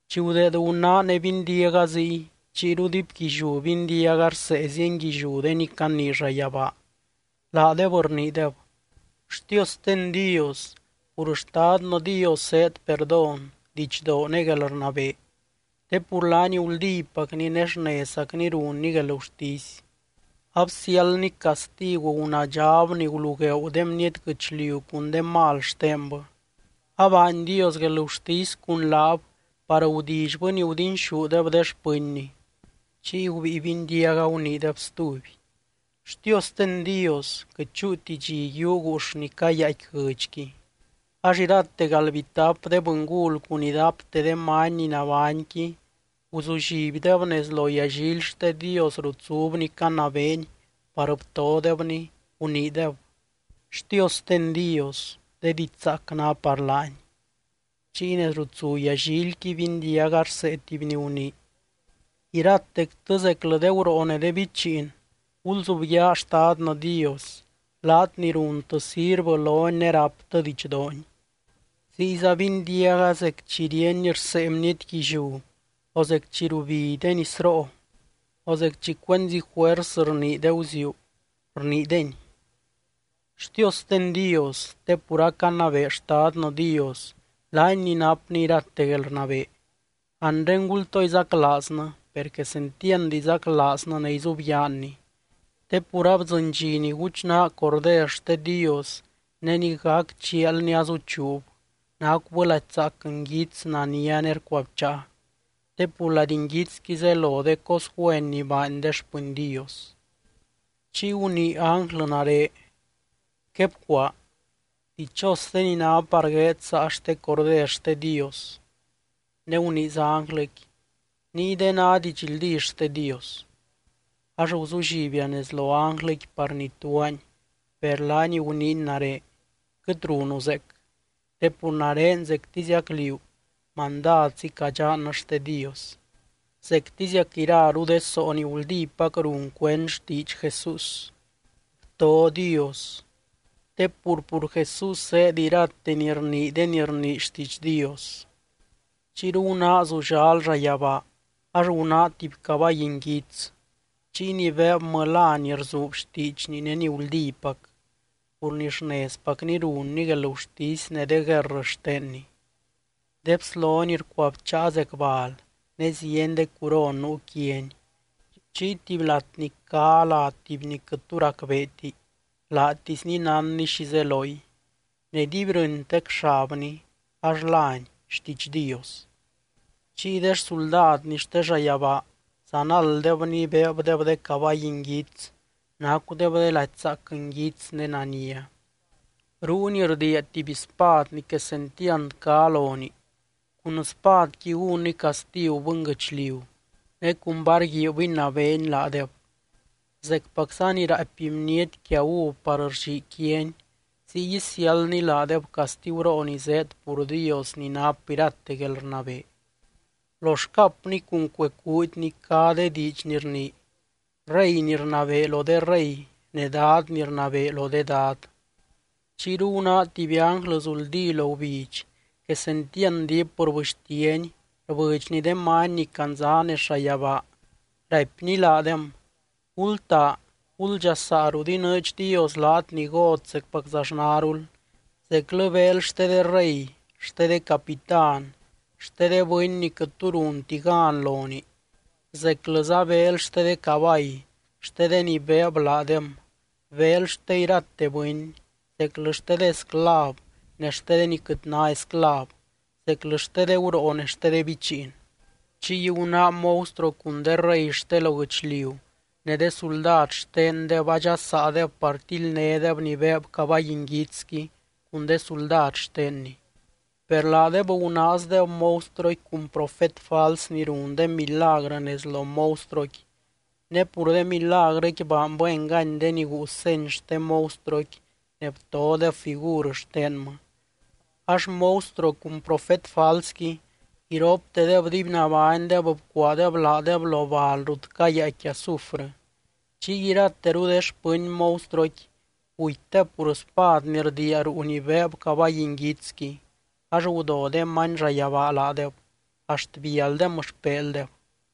Chi gudeed gunáa ne bindiaga ziy, chiyru diipguilliú bindiaga rsee zienguilliú de ni canii llayabaa, laadeb rniideb: ¡Xtiosten Dios! Pur Xtadnɨ Dios zéed perdón, didxdoo ne guelrnabee. Te pur laany guldípacny ne xnezzacny runny guelgurtisy, absiáldny castigu gunaadxab ni gulugueeu de bniety guɨchliu cun de mal xtenbɨ. Abaany Dios guelgurtisy cun laab par gudillybɨ ni gudinxúdeb de xpɨnny. Chiy gubíi bindiaga guniideb stuby: —¡Xtiosten Dios! Quɨt chúuti dxi yiuu guux ni cayaaicqui guɨdxqui. Ax irate galdbitap de bɨngul cun idapte de many ni nabányqui guzullibdeb nez lo yallily xte Dios rut zubny canabeeny par btodebny, guniideb: —¡Xtiosten Dios! ¡De diidx zaac ná par laany! Chiy nez rut zu yallilqui bindiaga rsee tuby ni gunii: Iratectɨ zeclɨ de guroo ne de bichiin gulzubyaa Xtadnɨ Dios, laat ni runtɨ sirvɨ lony ne ráptɨ didxdoony. Ziyza bindiaga zec chi ríeny rsee bniety guilliú, o zec chi rubi de nisroo, o zec chi cuenzi juers rnii de guziuu, rniideny: ¡Xtiosten Dios! Te pur acanabee Xtadnɨ Dios, laany ni napny irate guelrnabee. Anre gultoo izaclaaznɨ, per quesentiand izaclaaznɨ ne izubyaanny. Te pur abdzɨny dxi ni guchnaa Corder xte Dios ne ni gac chialny azuchuub, nacubɨ lady zaac, nguits, nania ne rcuabcháa. Te pur lady nguitsqui zelo de cos güen ni baany de xpɨny Dios. Chiy gunii ánglɨ nare: —Quebcuaa: “Dichos de ni ná par gueed saa xte Corder xte Dios.” Ne guniiza ánglɨqui: —Ninguide ná didxldí xte Dios. Ax guzullibia nez lo ánglɨqui par ituaany, per laany guniiny nare: —Quɨt runu zeec. Te pur nare zectiziac liú, mandadzi cadxannɨ xte Dios, zectiziac iraru de soo ni guldípac run cuend xtiidx Jesús. Bto Dios. Te pur, pur Jesús zéed irate ni rnii de ni rnii xtiidx Dios. Chiyru gunáa zullal llayabaa ax gunáa tuby cabay nguits. Chiy ni beebmɨ lá ni Rzuub xtiidxny ne ni Guldípac, pur ni xnezpacni runny guelgurtisy ne de guerr xtenny. De bslony rcuabcháa zec bal ne zieny de curon nuu quiany. Chiy tuby latny cá lá tuby ni quɨt tu racbeeti, laatisny nánny xi zeloy. Ne dibyrɨntec xabny, ax lány: XTIIDX DIOS. Chiy de xsuldadny xte llayabaa zanalddebny beebdeb de cabay nguits, nacudeb de lady zaac nguits ne nania. Ruuny rdiia tuby spad ni quesentiand cá lonii, cun spadqui gúnny castigu bɨnguɨchliu, ne cun var guiib inabeeny laadeb. Zecpacza ni raapy bniety quia uv par rllii quiani, ziy isiáldny laadeb castiguroo ni zéed pur Dios ni nap irate guelrnabee. Lo xcapny cun cuee cuudyny cá de diidx ni rnii: REY NI RNABEE LO DE REY NE DAD NI RNABEE LO DE DAD. Chiyru gunáa tuby ánglɨ zuldí lo gubidx, quesentiand diip rbɨxtiany, rbɨdxny de many ni candza nez llayabaa, raipny laadem: —Gultaa, guldxasaa rut inɨɨdx Dios laat ni got zecpaczaxnarul, zeclɨ beel xte de rey, xte de capitán, xte de bɨny ni quɨt tu runti gan lonii, zeclɨza beel xte de cabay, xte de ni beeb laadem, beel xte irate bɨny, zeclɨ xte de esclav ne xte de ni quɨt ná esclav, zeclɨ xte de guroo ne de bichiin. Chiy gunáa monstruo cun de rey xte lo guɨchliu ne de suldad xtendeb, adxasaadeb par tildnédeb ni beeb cabay nguitsqui cun de suldad xtenny. Per laadeb gunaazdeb monstruoqui cun profet fals ni run de milagrɨ nez lo monstruoqui. Ne pur de milagrɨqui baanbɨ engany de ni guu seny xte monstruoqui ne btodeb figur xtenmɨ. Ax monstruo cun profet falsqui, iroptedeb dibynabánydeb bcuaadeb laadeb lo bal rut cayaaicqui azufrɨ. Chiy irateru de xpɨny monstruoqui gutydeb pur spad ni rdiia ruu ni beeb cabay nguitsqui, ax gudo de many llayabaa laadeb, axt bialdem xpeeldeb.